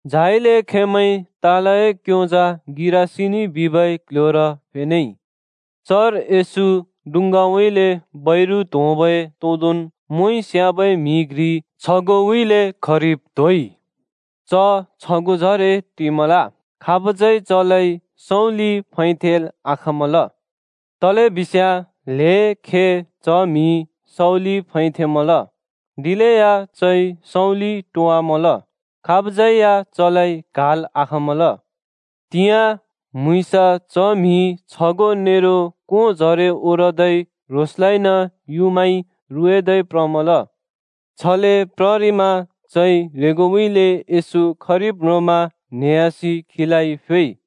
झाइले खेंमैं तालए क्‍योंजा गिरासिनी बिबै क्‍ल्‍ह्‍योर फेनेइ। चर येशू डुँङ्गाउँइँले बैरु त्‍होंबै तोदोंन् मोंइ स्‍याबै म्‍हि घ्रि छगोंउँइँले खरिब त्होइ। च छगोंजरे टिमल। खाबज्यै चलाइ सँउँलिइ फैथेंल् आखाँमल। तलेबिस्याँ ल्‍हें खे च म्‍हि सँउँलिइ फैथेंमल, दिलेया चइ सँउँलि टोंवामल। खाबज्‍यै या चलाइ क्हाल् आखाँमल। त्‍हिंयाँ, म्‍हुँइँसा च म्‍हि छगों नेरो कोंजरे ओरदै ह्रोंसलाइन युँमाइ रुएदै प्रमल। छले प्ररिमा चइ ह्रेंगोउँइँले येशू खरिब् म्रोंमा न्हेह्‍यासि खीलाइ फ्‍योइ।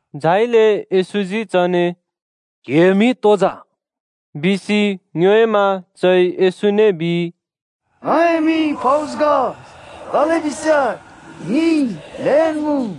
झाइले येशूजी चने “क्‍हिए मिं तो जा?” बिसि ङ्योएमा चइ येशूने बिइ, “ङए मिं फौज ग तलेबिस्याँ ङि ल्‍हेन् मुँ।”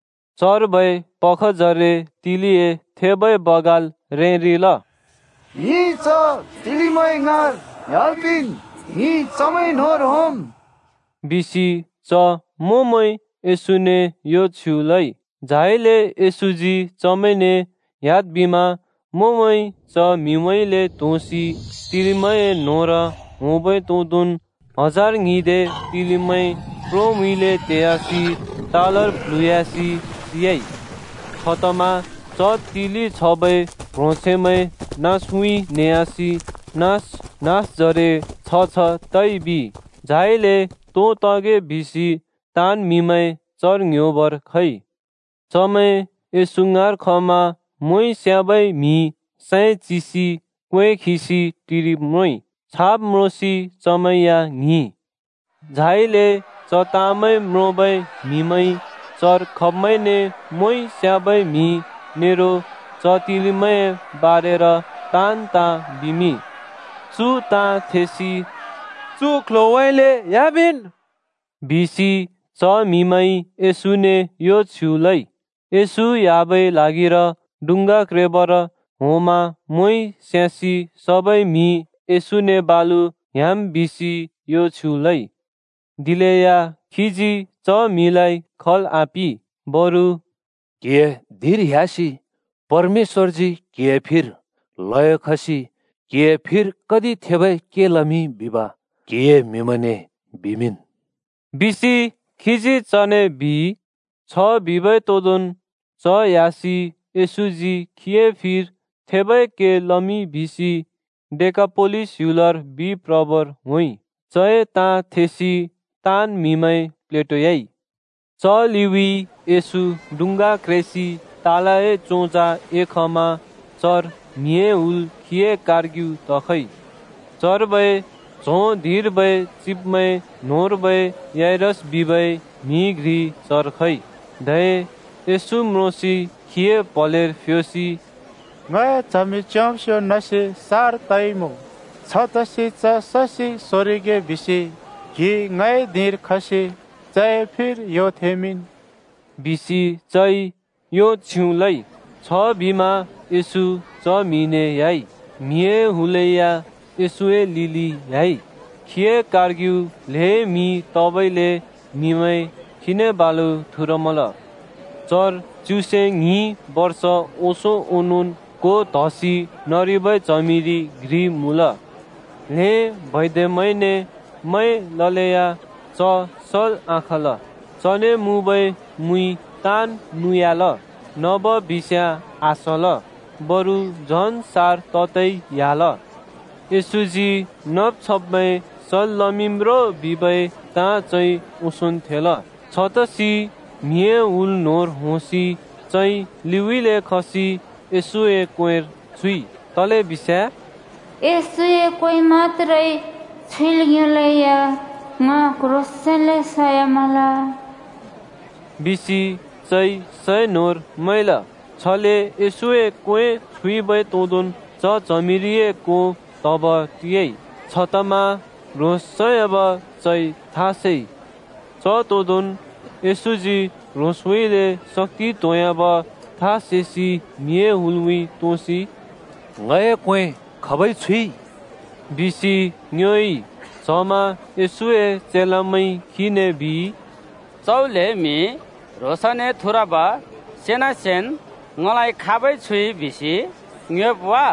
चर्बै पखजरे तिलिए थेबै बगाल रेंरिल। “ङि च तिलिमैंए ङाँर ह्‍याल् पिंन्, ङि चमैं न्‍होंर होंम्,” बिसि च मोंमैंइ येशूने यो छ्युँ लइ। झाइले येशूजी चमैंने ह्‍याद् बिमा मोंमैं च म्‍हिउँइँले त्‍होंसि तिलिमैंए न्‍होंर होंबै तोदोंन् हजार ङ्हिंदे तिलिमैं प्रोउँइँले तेयासि तालर प्ल्हुँह्‍यासि सियाइ। छतमा च तिलि छबै प्ह्रोंछैंमैं नाँसउँइँ न्हेह्‍यासि नाँस नाँसजरे छ छ तइ बिइ। झाइले तो तगे बिसि ताँन् म्‍हिमैं चर ङ्‌ह्‍योबर खइ। चमैं येशू ङाँर खमा मोंइ स्‍याबै म्‍हि सैं चिसि क्‍वें खिसि टिरिब् म्रोंइ। छाब् म्रोंसि चमैं या ङ्हिंइ। झाइले च ताँमैं म्रोंबै म्हिमैंइ चर खब्मैंने मोंइ स्‍याबै म्‍हि नेरो च तिलिमैंए बारेर ताँन् ताँ बिमिंइ। चु ताँ थेसि “चु क्‍ल्‍ह्‍योउँइँले ह्‍यामिंन्,” बिसि च म्हिमैंइ येशूने यो छ्युँ लइ। येशू ह्‍याबै ल्हागिर डुँङ्गा क्रेबर होंमा मोंइ स्‍यासि सबै म्‍हिइ येशूने बालु ह्‍याम् बिसि यो छ्युँ लइ। दिलेया खीजी च म्‍हिलाइ खल् आपिं। बरु “क्‍हिए धिंर ह्‍यासि परमेश्‍वरजी क्हिए फिर ल्हयो खसि क्‍हिए फिर कति थेबै के लमिंइ बिब क्‍हिए म्‍हिमैंने बिमिंन् बिसि खीजी चने,” बिइ। छ बिबै तोंदोंन् च ह्‍यासि येशूजी खीए फिर थेबै के लमिंइ बिसि डेकापोलिस ह्‍युलर बिप्रबर होंइ। चए ताँ थेसि ताँन् म्‍हिमैं प्लेटोयाइ। च लिउँइँ येशू डुङ्गा क्रेसि तालए चोंजा एखमा चर म्हिए हुल खीए कारर्ग्यु तखइ। चर्बै च्हों धिंर्बै चिब्मैं न्होंर्बै याइरस बिबै म्‍हि घ्रि चर खइ, धै येशू म्रोंसि खीए प्‍हलेर फ्योसि “ङए च्हमि च्‍योंब्स्यो नसि सार तइमुँ। छतसि च ससि सोरिगे बिसि क्‍हि ङए धिंर खसि चए फिर यो थेंमिंन्,” बिसि चइ यो छ्युँ लइ। छबिमा येशू च म्‍हिने ह्‍याइ। म्हिए हुल या येशूए लिलिन् ह्‍याइ, खीए कारर्ग्यु ल्हें म्हि तबइले म्हिमैं खीने थुरमल। चर च्युसे ङ्हिं बर्ष ओंसों ओनोंन् को त्‍हसि नरिबै च्हमिरि घ्रि मुँल। ल्‍हें बैद्यमैंने मैं ललेया च सल् आखाँल। चने मुँबै मुइ ताँन् नुयाल, नब बिस्याँ आसल, बरु झन् सार ततै ह्‍याल। येशूजी नब् छब्मैं सल् लमिंम् रो बिबै ताँ चइ ओंसोंन् थेल, छतसि म्हिए हुल न्होंर होंसि चइ लिउँइँले खसि येशूए क्‍वेंर छुइ। तलेबिस्याँ “येशूए क्‍वें मत्‍त्रे छुइल् योंलेया ङ क्ह्रोंसेंन्ले सयामल,” बिसि चइ सैं न्होंर मैंल। छले येशूए क्वें छुइबै तोंदोंन् च च्हमिरिए को त्‍हब टियाइ। छतमा ह्रोंस सयाब चइ था सेइ। च तोदोंन् येशूजी ह्रोंसउँइँले शक्‍ति त्‍होंह्‍याब था सेसि म्हिए हुलउँइँ तोसि “ङए क्‍वें खाबइ छुइ?” बिसि ङ्योएइ। च्हमा येशूए चेलामैंइ खीने बिइ, “च्‍हौ ल्हें म्हि ह्रोंसने थुरब सेनासेन्, ‘ङलाइ खाबइ छुइ’ बिसि ङ्योएब् वा?”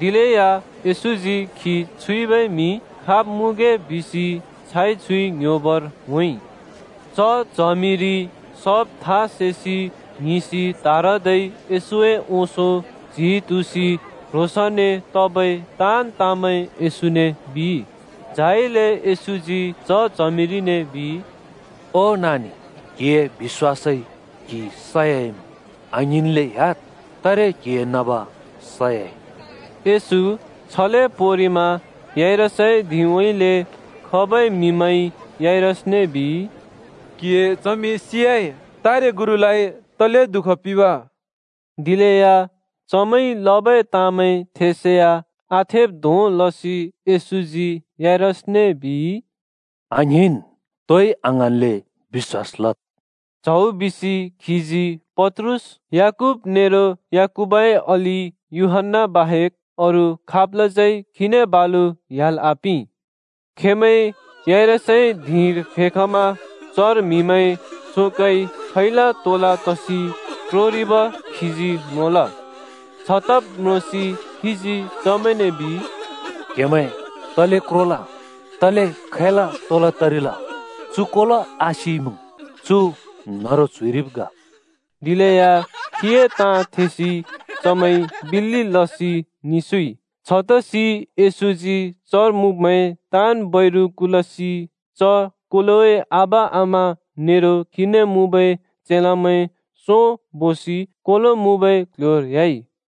दिलेया येशूजी खी छुइबै म्‍हि खाब् मुँगे बिसि छाइ छुइ ङ्‌ह्‍योबर होंइ। च च्हमिरि सब था सेसि ङ्हिंसि त्‍हारदै येशूए ओंसों च्‍हि तुँसि ह्रोंसने तबै ताँन् ताँमैं येशूने बिइ। झाइले येशूजी च च्हमिरिने बिइ, “ओ नानि, क्‍हिए बिश्‍वासइ क्‍हि सयाइमुँ। आङ्हिंनले ह्‍याद्, तारे क्हिए नब सयाइ।” येशू छले पोंरिमा याइरसए धिंउँइँले खबै म्‍हिमैंइ याइरसने बिइ, “क्‍हिए च्हमि सियाइ। तारे गुरुलाइ तले दुःख पिंब?” दिलेया चमैंइ लबै ताँमैं थेसेया आथेब् धों लसि येशूजी याइरसने बिइ, “आङ्हिंन्, तोइ आङ्हाँन्ले बिश्‍वास लद्।” च्हौ बिसि खीजी पत्रुस, याकूब नेरो याकूबए अलि यूहन्‍ना बाहेक् अरू खाबलाज्यै खीने बालु ह्‍याल् आपिं। खेंमैं याइरसए धिंर फेखमा चर म्हिमैं शोकइ खैला तोला तसि क्रोरिब खीजी म्रोंल। छ तब् म्रोंसि खीजी चमैंने बिइ, “क्‍हेमैं तले क्रोल? तले खैला तोला तरिल? चु कोलो आसिइमुँ, चु न्‍हरु च्‍हुरिइब् ग।” दिलेया खीए ताँ थेसि चमैंइ बिल्‍लि लसि निस्युइ। छतसि येशूजी चर मुँब्मैं ताँन् बैरु कुलसि च कोलोए आबा-आमा नेरो खीने मुँबै चेलामैं सों बोसि कोलो मुँबै क्‍ल्‍ह्‍योर ह्‍याइ।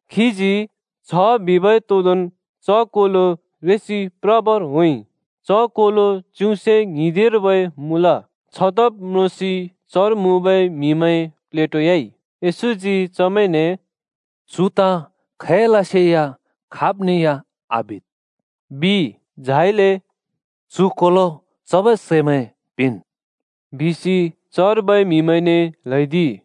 खीजी छ बिबै तोदोंन् च कोलो रेसि प्रबर होंइ। च कोलो च्युसे ङ्हिदिंर्बै मुँल। छ तब् म्रोंसि चर मुँबै म्‍हिमैं प्लेटोयाइ। येशूजी चमैंने “चु ताँ खैलसेया खाब्ने या आबिद्,” बिइ। झाइले “चु कोलो चबै सैमैं पिंन्,” बिसि चर्बै म्हिमैंने ल्हैदिइ।